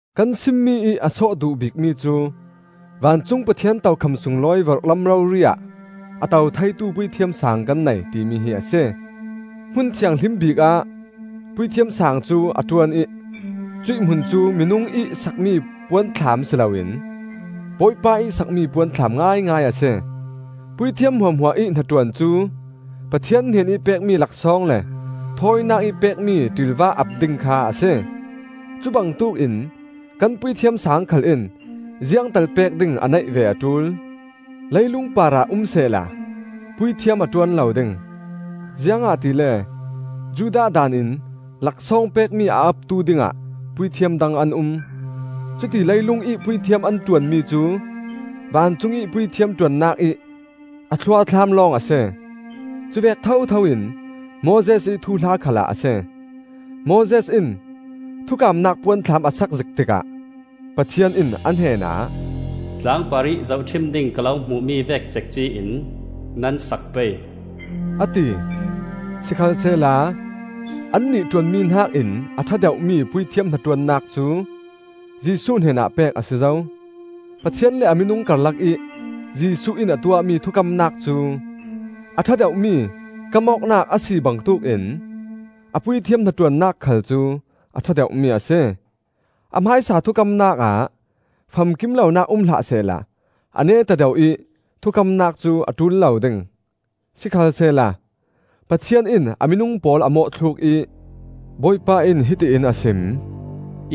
Kan simmi ih a sawh duh bikmi cu: vancung Pathian tokham sunglawi vorhlam rori ah a to theitu Puithiam Saang kan nei, timi hi a si. Hmun Thianghlim bikah Puithiam Saang cu a ṭuan ih cuih hmun cu minung ih sakmi puanthlam si loin Bawipa ih sakmi puanthlam ngaingai a si. Puithiam hmuahhmuah ih hnaṭuan cu Pathian hnenih pekmi laksawng le thawinakih pekmi ṭilva ap ding kha a si; cubangtuk in kan Puithiam Saang khal in ziangtal pek ding a neih ve a ṭul. Leilung parah um sehla puithiam a ṭuan lo ding, ziangahtile Judah daanin laksawng pekmi a aptu dingah puithiam dang an um. Cuti leilungih puithiam an ṭuanmi cu vancungih puithiam ṭuannak ih a thluathlam lawng a si. Cuvek thothoin Moses ih thuhla khalah a si. Moses in thukamnak puanthlam a sak zik tikah Pathian in a hnenah, “Tlang parih zohṭhim ding ka lo hmuhmi vek cekci in nan sak pei,” a ti. Sikhalsehla annih ṭuanmi hnakin a ṭha deuhmi puithiam hnaṭuannak cu Jesuh hnenah pek a si zo. Pathian le a minung karlakih Jesuh in a tuahmi thukamnak cu a ṭha deuhmi kamawknak a si bangtuk in a puithiam hnaṭuannak khal cu a ṭha deuhmi a si. A hmaisa thukamnak ah famkim lonak um hlah sehla a neta deuh ih thukamnak cu a ṭul lo ding. Sikhalsehla Pathian in a minung pawl a mawhthluk ih, “Bawipa in hiti in a sim: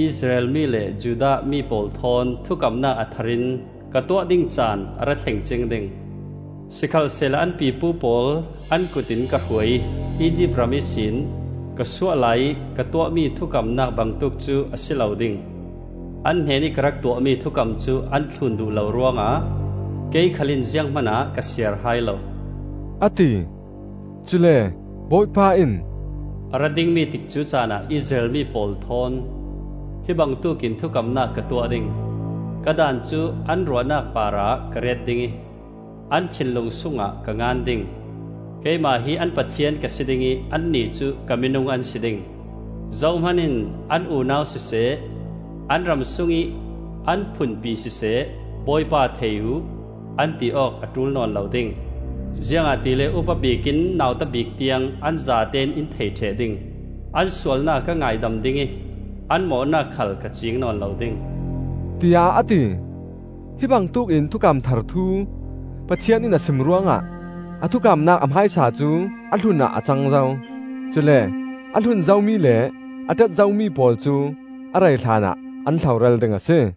Israel mi le Judah mi pawl thawn thukamnak a thar in ka tuah ding caan a ra thleng cing ding. Sikhalsehla an pipu pawl an kutin ka hruai ih Izipt ram ihsin, ka suah laiih ka tuahmi thukamnak bangtuk cu a si lo ding. An hnenih ka rak tuahmi thukam cu an thlun duh lo ruangah kei khal in zianghman ah ka siar hai lo,” a ti. Cule Bawipa in: “A ra dingmi tikcu caanah Israel mi pawl thawn hi bangtuk in thukamnak ka tuah ding; Ka daan cu an ruahnak parah ka ret ding ih, an thinlung sungah ka ngan ding. Keimah hi an Pathian ka si dingih annih cu ka minung an si ding. Zohman in an unau siseh an ramsungih an phunpi siseh, ‘Bawipa thei uh,’ an ti awk a ṭul nawn lo ding. Ziangahtile upa bik in nauta bik tiang an zatein in thei ṭheh ding. An sualnak ka ngaidam ding ih, an mawhnak khal ka ciing nawn lo ding,” tiah a ti. Hi bangtuk in thukam thar thu Pathian in a sim ruangah a thukamnak a hmaisa cu a hlun ah a cang zo; cule a hlun zomi le a ṭet zomi pawl cu a rei hlanah an hloral ding a si.